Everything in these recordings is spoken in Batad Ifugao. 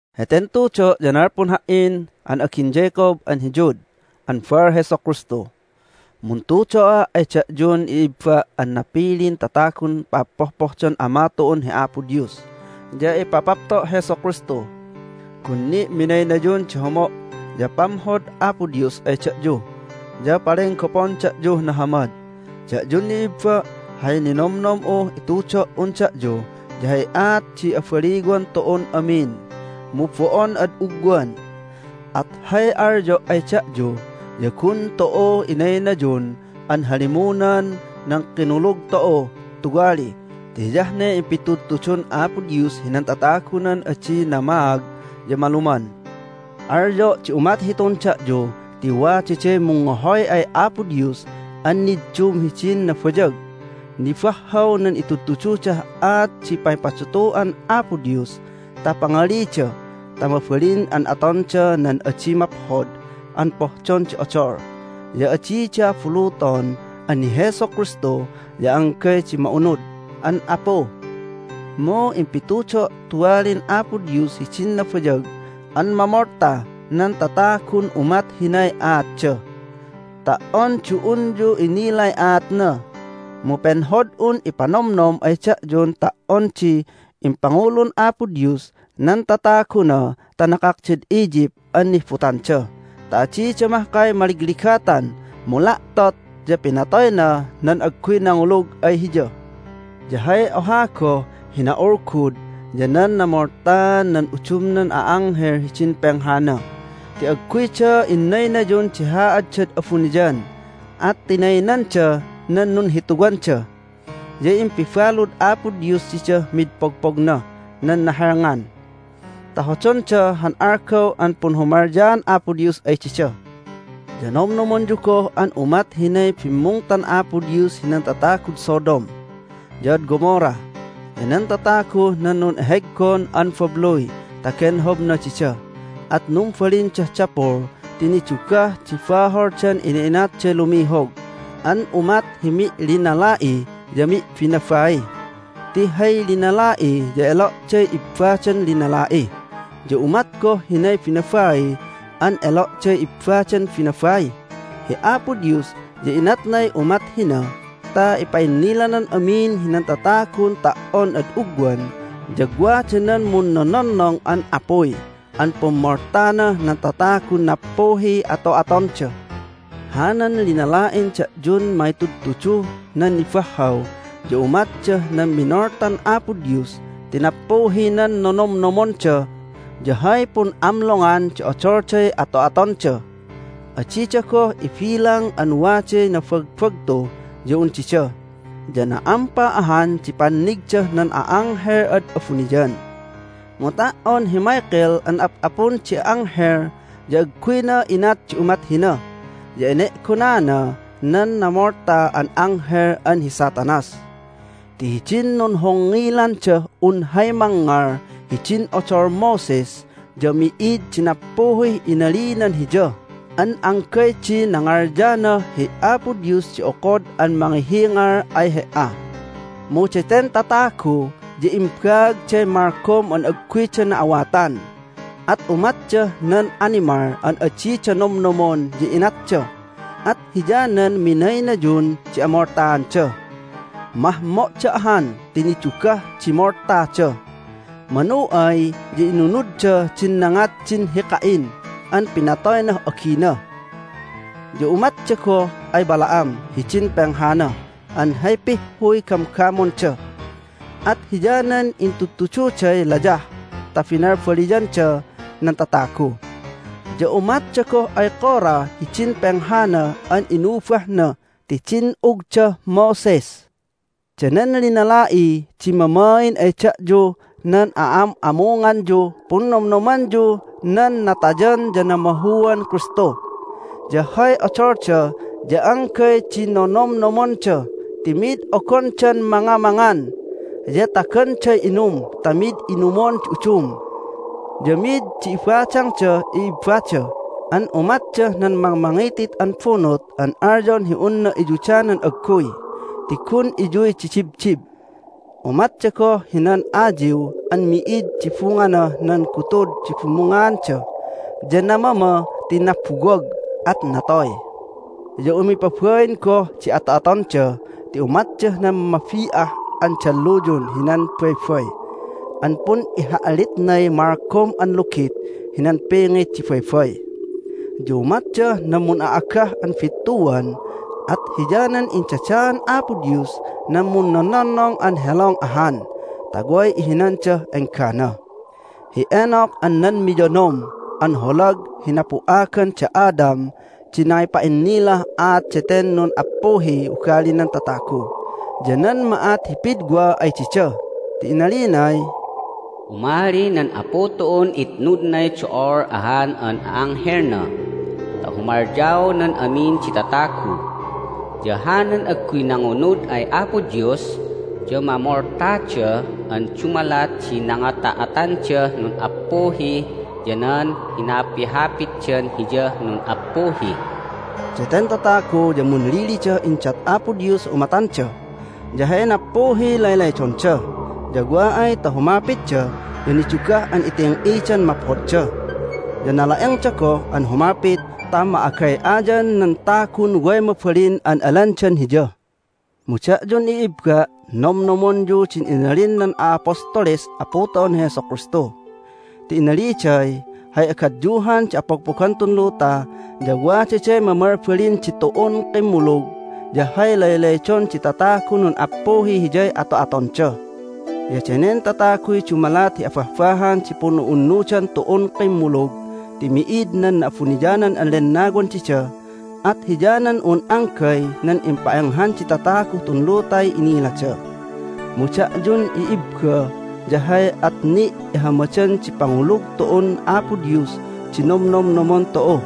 Heten tudo' ya nalpun ha"in an agin Jacob an hi Jude an baal Jesu Kristu. Muntudo'a' ay da'yun i'ibba' an napilin tatagun pa'appohdon Ama tu'un hi Apo Dios ya ipapapto' Jesu Kristu. Gun ni' minaynayun di homo' ya pamhod Apo Dios ay da'yu, ya palenggopon da'yuh nahamad. Da'yun i'ibba', hay ninomnom'uh itudo"un da'yu ya hay aat di abaliwan tu'un amin, mu bo'on ad ugwan. At hay alyo' ay da'yu ya gun tu'u inaynayun an halimunan nan kinulug tu'u tuwali ti hiyah ne impitudtudun Apo Dios hinan tatagunan adi namaag ya maluman. Alyo' di umat hitun da'yu ti wadaday mungngohoy ay Apo Dios an niddum hidin nabayag. Nibahhaw nan itudtududah aat di pangipadutu'an Apo Dios ta pangalida ta mabalin an atonda nan adi maphod an pohdon di odol. Ya adida abuluton an hi Jesu Kristu ya anggay di ma'unud an Apu, mu impitudo' tuwalin Apo Dios hidin nabayag an mamolta nan tatagun umat hinay aatda. Ta"on di unyu inilay aatna mu penhod'un ipanomnom ay da'yun ta"on di impangulun Apo Dios nan tataguna ta nakakdad Egypt an nihbutanda ta adida mahkay maligligatan mu la'tot ya pinatoyna nan agguy nangulug ay Hiya. Ya hay oha goh hi na'ulgud ya nan namoltaan nan udumnan a'anghel hidin penghana ti agguyda innaynayun di haaddad abuniyan, at tinaynanda nan nunhituwanda. Ya impibalud Apo Dios didah mid pogpognah nan nahelngan ta hodonda han algaw an punhumalyaan Apo Dios ay dida. Ya nomnomonyu goh an umat hinay bimmungtan Apo Dios hinan tatagud Sodom, ya ad Gomorrah, ya nan tataguh nan nun'eheggon an babluy ta genhobna dida, at numbalindah dapul ti nidugah di baholdan ina'inatday lumihog an umat hi mi'linala'i ya mi'binabai, ti hay linala'i ya elo'day ibbadan linala'i, ya umat goh hinay binabai an elo'day ibbadan binabai. Hi Apo Dios ya inatnay umat hina ta ipa'innilanan amin hinan tatagun ta"on ad ugwan ya wada nan munnononnong an apuy an pummoltanah nan tatagun nappuhiy ato'atonda. Hanan linala'in da'yun mangitudtuduh nan nibahhaw ya umatdah nan minoltan Apo Dios ti nappuhi nan nonomnomonda ya hay pun'amlongan di odolday ato'atonda. Adida goh ibilang an waday nabagbagtu ya un dida, ya na'ampa ahan di pannigdah nan a'anghel ad abuniyan. Mu ta"on hi Michael an ap'apun di anghel ya agguyna inat di umat hina, ya ene'gonana nan namolta an anghel an hi Satanas. Ti hidin nunhongngilandah un hay mangngal hidin odol Moses ya mi'id di nappuhih inalinan hiya an anggay di nangalyanah, "Hi Apo Dios di okod an mangihingal ay he"a!" Mu daten tatagu ya imbaagday malgom an agguyda na'awatan. At umatdah nan animal an adida nomnomon ya inatda, at hiyanan minaynayun di amoltaanda. Mahmo'da ahan ti nidugah di moltada! Manu ay ya inunudda din nangat din hi Cain an pinatoynah agina. Ya umatda goh ay Balaam hidin penghana an hay pihhuy gamgamonda, at hiyanan intudtududay layah ta binalbaliyanda nan tatagu. Ya umatda goh ay Korah hidin penghana an inubahna ti din'ugdah Moses. Danen linala'i di mamain ay da'yuh nan a'am'amunganyuh Punnomnomanyuh nan Natayan ya Namahuan Kristu. Ya hay odolda ya anggay di nonomnomonda ti mid ogondan mangamangan, ya taganday inum ta mid inumon di udum. Ya mid di ibadangdah i'ibbada an umatdah nan mangmangitit an bunut an alyon hi unna iyudanan agguy ti gun iyuy di dibdib. Umatda goh hinan ayiw an mi'id di bunganah nan gutud di bumungaanda, ya namama ti nabuwag, at natoy. Ya umipabain goh di ato'atonda ti umatdah nan mabi'ah an dalluyun hinan baybay an pun'iha'litnay malgom an lugit hinan pingit di baybay. Ya umatdah nan mun'a'agah an bittuan, at hiyanan indadaan Apo Dios nan munnononnong an helong ahan ta way ihinandah enggana. Hi Enoch an nan miyonom an holag hi napu'agan da Adam di nangipa'innilah aat daten nun'appuhiy ugalinan tatagu ya nan ma'at hi pidwa ay dida ti inalinay, "Umali nan Apu tu'un itnudnay do'ol ahan an a'anghelna ta humalyaonan amin di tatagu. Ya hanan agguy nangunud ay Apo Dios ya mamoltada an dumalat di nangata'atandah nun'appuhi ya nan hinapihapitdan Hiyah nun'appuhi." Daten tatagu ya munlilidah indat Apo Dios hi umatanda, ya hay nappuhiy laylaydonda. Ya wa ay ta humapitda ya nidugah an iting'idan maphodda. Ya nala'engda goh an humapit ta ma'agay'ayan nan tagun way mabalin an alandan hiya. Mu da'yun i'ibba', nomnomonyu din inalin nan a'apostoles Apu tu'un hi Jesu Kristu. Ti inaliday, "Hay agadyuhan di apogpogan tun luta ya wadaday mamalbalin ditu'un kimmulug, ya hay laylaydon di tatagun nun'appuhiy hiyay ato'atonda." Ya danen tataguy dumalat hi abahbahan di pun'u'unnudan tu'un kimmulug ti mi'id nan Na'abuniyanan an Lennawan dida, at hiyanan un anggay nan impa'enghan di tataguh tun lutay inilada. Mu da'yun i'ibba ya hay at ni' ihamadan di pangulug tu'un Apo Dios di nomnomnomon tu'u.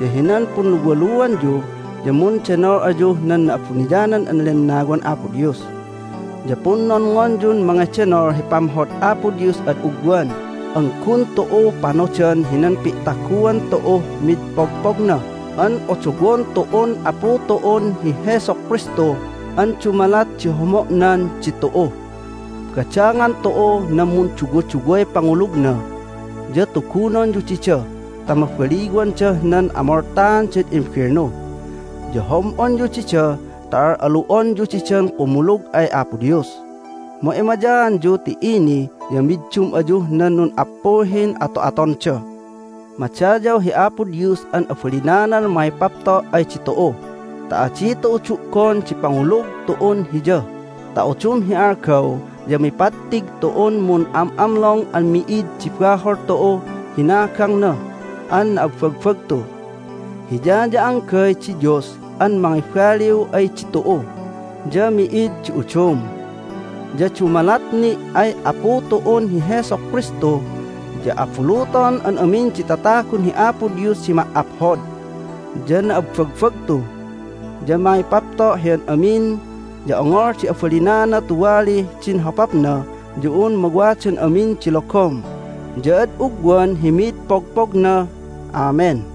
Ya hinan punluwaluanyu ya mundenol ayuh nan Na'abuniyanan an Lennawan Apo Dios. Ya punnonngonyun mangedenol hi pamhod Apo Dios ad ugwan an gun tu'u panodan hinan pi'taguan tu'uh mid pogpogna an odowon tu'un Apu tu'un hi Jesu Kristu an dumalat di homo'nan ditu'u. Badangan tu'u nan munduwaduway pangulugna, ya tugunonyu dida ta mabaliwandah nan amoltaandad imbelnu. Ya hom'onyu dida ta al'alu'onyu didan kumulug ay Apo Dios. Mu emayaanyu ti ini ya middum ayuh nan nun'appuhin ato'atonda. Madayaw hi Apo Dios an abalinanan mangipapto' ay ditu'u ta adi tu'u du'gon di pangulug tu'un Hiya ta udum hi algaw ya mipattig tu'un mun'am'amlong an mi'id di bahol tu'uh hinagangna an na'abbagbagtu. Hiya ya anggay di Dios an mangibaliw ay ditu'u, ya mi'id di udum. Ya dumalat ni' ay Apu tu'un hi Jesu Kristu ya abuluton an amin di tatagun hi Apo Dios di ma"aphod, ya na'abbagbagtu, ya mangipapto' hi an amin, ya ongol di abalinana tuwalih din hopapna ya un mawadan amin di logom ya ad ugwan hi mid pogpogna! Amen.